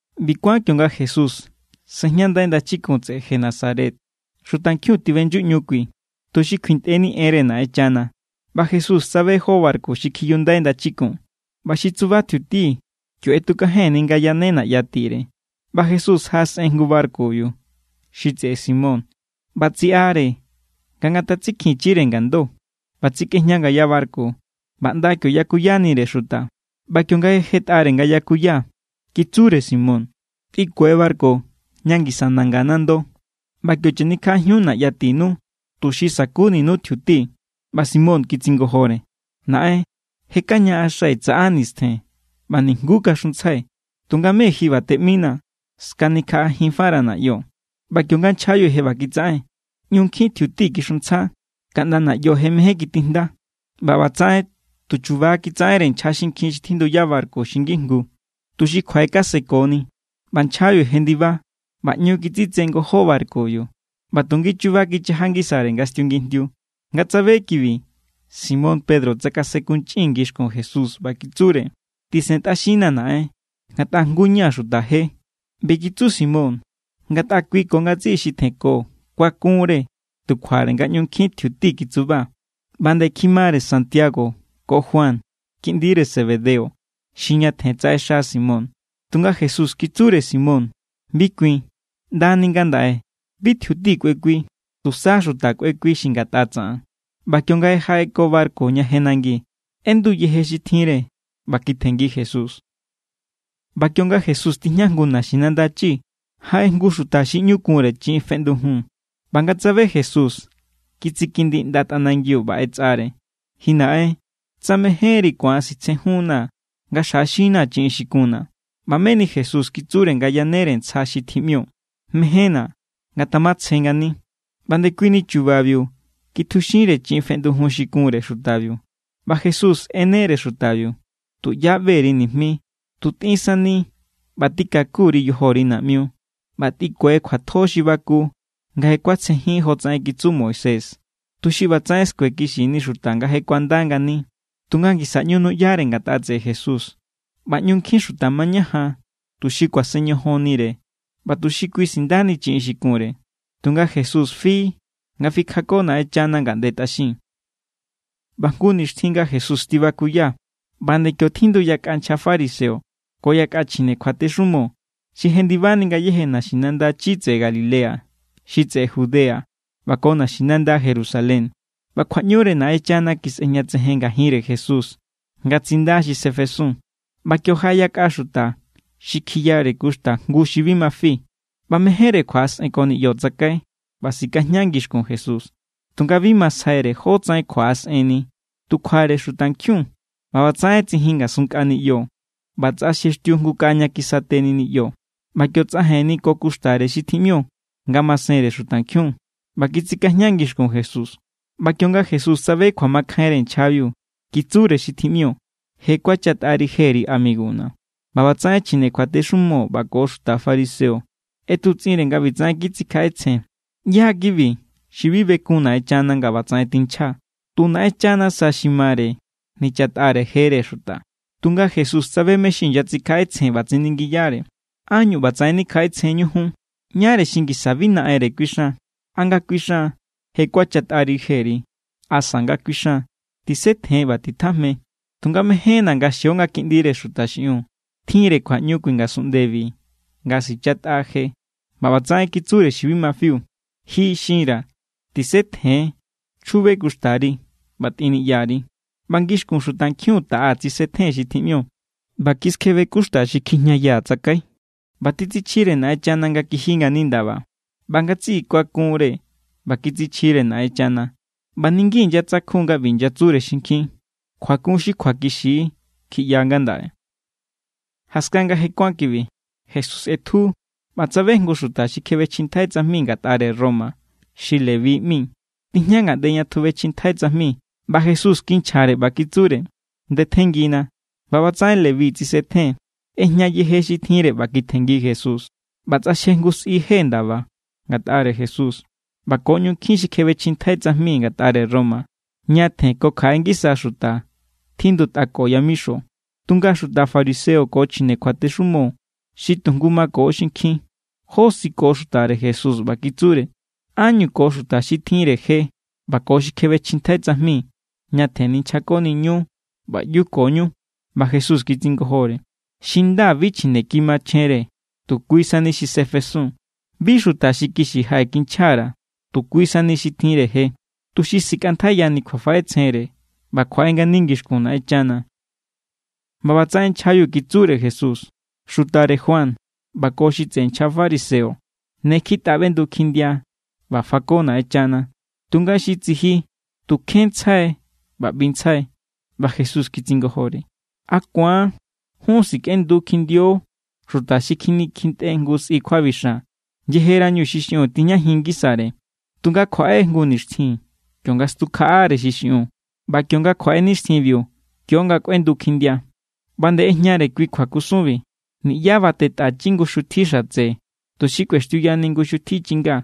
ꞌBi kuán kionga Jesús sejñandai ndachikun tseꞌe Genesaret, xutankjiun tiꞌbeꞌnyuꞌñu kui tuxi kjuintꞌeni enre Naꞌenchana. ꞌBa Jesús tsabe jó barku xi kjiyundai ndachikun, ꞌba xi tsuba tjiuti kio ꞌetukajenni nga yane naꞌya tire. ꞌBa Jesús jaꞌasꞌen jngu barkubiu, xi tseꞌe Simón, ꞌba tsiꞌare nga ngatatsikjinchire ngando. ꞌBa tsikꞌejña ngaya barku, ꞌba ꞌnda kio yakuyanire xuta. ꞌBa kionga je jetꞌare nga yakuya, kitsure Simón: —Tꞌinkue barku ña ngisa nanga nando, ꞌba kio chanikjaꞌajiun naꞌya tinu tuxi sa̱kuninu tjiuti. ꞌBa Simón kitsingojore: —Naꞌen, je kañaꞌaxai̱ tsaꞌa nistjen ꞌba nijnguú kaxuntsjai. Tunga mé ji ꞌba teꞌminaa̱, skanikjaꞌajinfara̱ naꞌyo. ꞌBa kionga nchjabiu je ꞌba kitsaꞌen, ꞌñu nkjin tjiuti kixuntsja kaꞌnda naꞌyo je mejen kitijnda. ꞌBa ꞌbatsaꞌen tu chuba= kitsaꞌenre nchja xinkjin xi tjinduya barku xi ngijngu, tuxi kjuaꞌekasekoni. ꞌBa nchjabiu jendiba, ꞌba ꞌñu kitsitse ngojó barkubiu ꞌba tu ngichuba kichaja ngisare nga stiungijndiu. Nga tsabe kibi, Simón Pedro tsakasenkunchꞌin ngixkun Jesús, ꞌba kitsure: —Tisentꞌaxinnaa̱ Naꞌen, ngatꞌa jngu= ña̱ xuta je. ꞌBi kitsu Simón ngatꞌa kui ko ngatsiꞌi xi tjenko kuakunre tu kjuare nga ꞌñu nkjin tjiuti kitsuba. ꞌBa nde kjimare Santiago ko Juan, kiꞌndire Zebedeo, xi ñatjen tsaꞌexa Simón. Tunga Jesús kitsure Simón: —Bi kuin. ꞌNdani ngandaꞌe bi tjiuti kꞌuekui, tusa xuta kꞌuekui xi ngatꞌa tsaꞌan. ꞌBa kionga je jaꞌeko barku ña je nangi, ꞌendu yeje xi tjinre ꞌba kitjenngi Jesús. ꞌBa kionga Jesús tijña jngu naxinanda chi, jaꞌe jngu xuta xi ꞌñu kunre chiꞌin feꞌndujun. ꞌBa nga tsabe Jesús, kitsikindi ꞌnda tꞌanangiu ꞌba ꞌetsꞌare: —Ji naꞌen, tsa mejénri, ku̱an sitsejunnaa̱ nga xjaꞌaxinnaa̱ chiꞌin xi kunna̱. ꞌBa meni Jesús kitsure nga yanere ntsja xi tjiꞌmio: —Mejénna̱. Ngatamatsje ngani. ꞌBa ndekuini chubabiu kitjuxinre chiꞌin feꞌndujun xi kunre xutabiu. ꞌBa Jesús ꞌenere xutabiu: —Tuꞌyá ꞌbe_ri nijmi. Tu tꞌin sani ꞌba tikaku_ri yojori naꞌmiu. ꞌBa tꞌikue kjuatjo xi baku nga je kuatsjejin jotsaꞌen kitsu Moisés, tuxi ꞌbatsaꞌen skuekixini xuta nga je kuanda ngani. Tunga ngisa ꞌñu nuꞌyare ngatꞌa tseꞌe Jesús, ꞌba ꞌñu nkjin xuta mañajan tuxi kuasen ñojonnire ꞌba tuxi kui sindani chiꞌin xi kunre. Tunga Jesús fi nga fikjako Naꞌenchana ngaꞌnde tꞌaxin. ꞌBa jngu nixtjin nga Jesús tibakuya, ꞌba nde kio tjindu yakꞌa nchja fariseo ko yakꞌa chjine kjuatexumo xi jendibani ngayéje naxinanda chi tseꞌe Galilea, xi tseꞌe Judea, ꞌba ko naxinanda Jerusalén. ꞌBa kjuaꞌñure Naꞌenchana kisꞌejñatsejen ngajinre Jesús nga tsinda xi sefesun. ꞌBa kio jaꞌe yakꞌa xuta xi kjiyare kuxta jngu xi bi ma fi. ꞌBa mejénre kjuaꞌasꞌenko niꞌyo tsakai ꞌba sikajña ngixkun Jesús. Tunga bi masjaire jótsaꞌen kjuaꞌasꞌenni, tu kjuare xutankjiun. ꞌBa ꞌbatsaꞌen tsijin ngasun nkꞌa niꞌyo, ꞌba tsꞌaxjextiu jngu kaꞌa ña kisate niꞌyo, ꞌba kio tsꞌajenni ko kuxtare xi tjiꞌmio ngamasenre xutankjiun ꞌba kitsikajña ngixkun Jesús. ꞌBa kionga Jesús tsabe kjuamakjainre nchjabiu, kitsure xi tjiꞌmio: —Je kuachatꞌari jeri amiguna̱. ꞌBa ꞌbatsaꞌen chjine kjuatexumo ꞌba ko xuta fariseo ꞌetutsꞌinre nga ꞌbitsaꞌen kitsikjaꞌetsjen: “¿ꞌYá= kibi xi bi bekun Naꞌenchana nga ꞌbatsaꞌen tinchja? Tu Naꞌenchana sa xi mare nichatꞌare jere xuta.” Tunga Jesús tsabe mé= xi inyatsikjaꞌetsjen, ꞌba tsiningiyare: —¿Ánñu ꞌbatsaꞌen nikjaꞌetsjenñu jun? Ñáre xi ngisa bi naꞌenre kuixan: ¿A nga kuixan: “Je kuachatꞌari jeri”? ¿Asa nga kuixan: “Tisetjen ꞌba titjajme”? Tunga mejénna̱ nga xio nga Kiꞌndire Xuta xiꞌiun tjinre kjuaꞌñu kui ngasunꞌndebi nga sichatꞌa je. ꞌBa ꞌbatsaꞌen kitsure xi bi ma fiu: —Ji xinra̱, tisetjen, chjube kuxtari ꞌba tꞌin niꞌyari. ꞌBa ngixkun xutankjiun taꞌa tsisetjen xi tjiꞌmio ꞌba kiskjebe kuxta xi kjijñayaa̱ tsakai, ꞌba titsichjire Naꞌenchana nga kiji ngani ndaba. ꞌBa ngatsiꞌi kuakunre ꞌba kitsichjire Naꞌenchana, ꞌba niki inyatsakjun= nga ꞌbi kitsure xinkjin: —Kjuakun xi kjuakixi= kjiꞌya ngandaꞌe. Jaskan nga je kuán kibi, Jesús ꞌetju ꞌba tsabe jngu xuta xi kjebechjintjai tsajmi ngatꞌare Roma xi Leví ꞌmi. Tijña ngaꞌnde ña tjubechjintjai tsajmi. ꞌBa Jesús kinchjare ꞌba kitsure: —Ndetjenngina. ꞌBa ꞌbatsaꞌen Leví tsisetjen, ꞌejña yeje xi tjinre ꞌba kitjenngi Jesús. ꞌBa tsꞌaxje jngu sꞌi je ndaba ngatꞌare Jesús; ꞌba ko ꞌñu nkjin xi kjebechjintjai tsajmi ngatꞌare Roma, ñatjen ko kjaꞌe ngisa xuta, tjindutꞌako yamixo. Tunga xuta fariseo ko chjine kjuatexumo xi tujngu mako xinkjin josiko xutare Jesús, ꞌba kitsure: —¿Ánñu ko xuta xi tjinre je ꞌba ko xi kjebechjintjai tsajmi ñatjen ninchjakoniñu ꞌba ꞌyukoñu? ꞌBa Jesús kitsingojore: —Xi nda bi chjineki machjenre, tu kui sani xi sefesun. Bi xuta xi kixi jaꞌekinchja_ra̱, tu kui sani xi tjinre je, tuxi sikꞌantjaiyani kjuafaꞌetsjenre ꞌba kjuaꞌe ngani ngixkun Naꞌenchana. ꞌBa ꞌbatsaꞌen nchjabiu kitsure Jesús: —Xutare Juan ꞌba ko xi tseꞌe nchja fariseo ne kjitꞌa ꞌbendu kjindia ꞌba fako Naꞌenchana, tunga xi tsiji tu kjenntsjai ꞌba ꞌbintsjai. ꞌBa Jesús kitsingojore: —¿A ku̱an jun sikꞌendu kjindio xuta xi kjinikjintꞌe jngu sꞌi kjuabixan yejerañu xi xiꞌiun tijñajin ngisare? Tunga kjuaꞌe jngu nixtjin kionga stukjaꞌare xi xiꞌiun, ꞌba kionga kjuaꞌe nixtjinbiu, kio=nga kꞌuendu kjindia. ꞌBa nde ꞌejñare kui kjuakusunbi: —Niꞌyá batetꞌachi jngu xutji xatse tuxi kꞌuextiuyani jngu xutji chinga.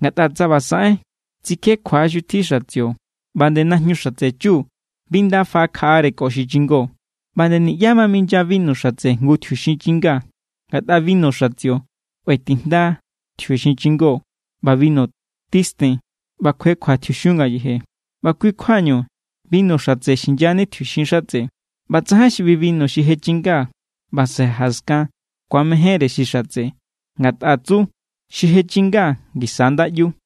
Ngatꞌa tsa ꞌba saꞌen, tsikjekjua= xutji xatsio; ꞌba nde najñu xatse chu bi nda faꞌakjare ko xi chingo. ꞌBa nde niꞌyá minya binu xatse jngu tjiuxin chinga. Ngatꞌa binu xatsio kꞌuetijnda tjiuxin chingó, ꞌba binu titsen ꞌba kjuekjua tjiuxiun ngayeje. ꞌBa kui= kjuañu binu xatse xinyani tjiuxin xatse. ꞌBa tsajain xi ꞌbi binu xi je chinga ꞌba saꞌe jaskan ku̱amejénre xi xatse, ngatꞌa tsu: “Xi je chinga ngisa nda ꞌyu.”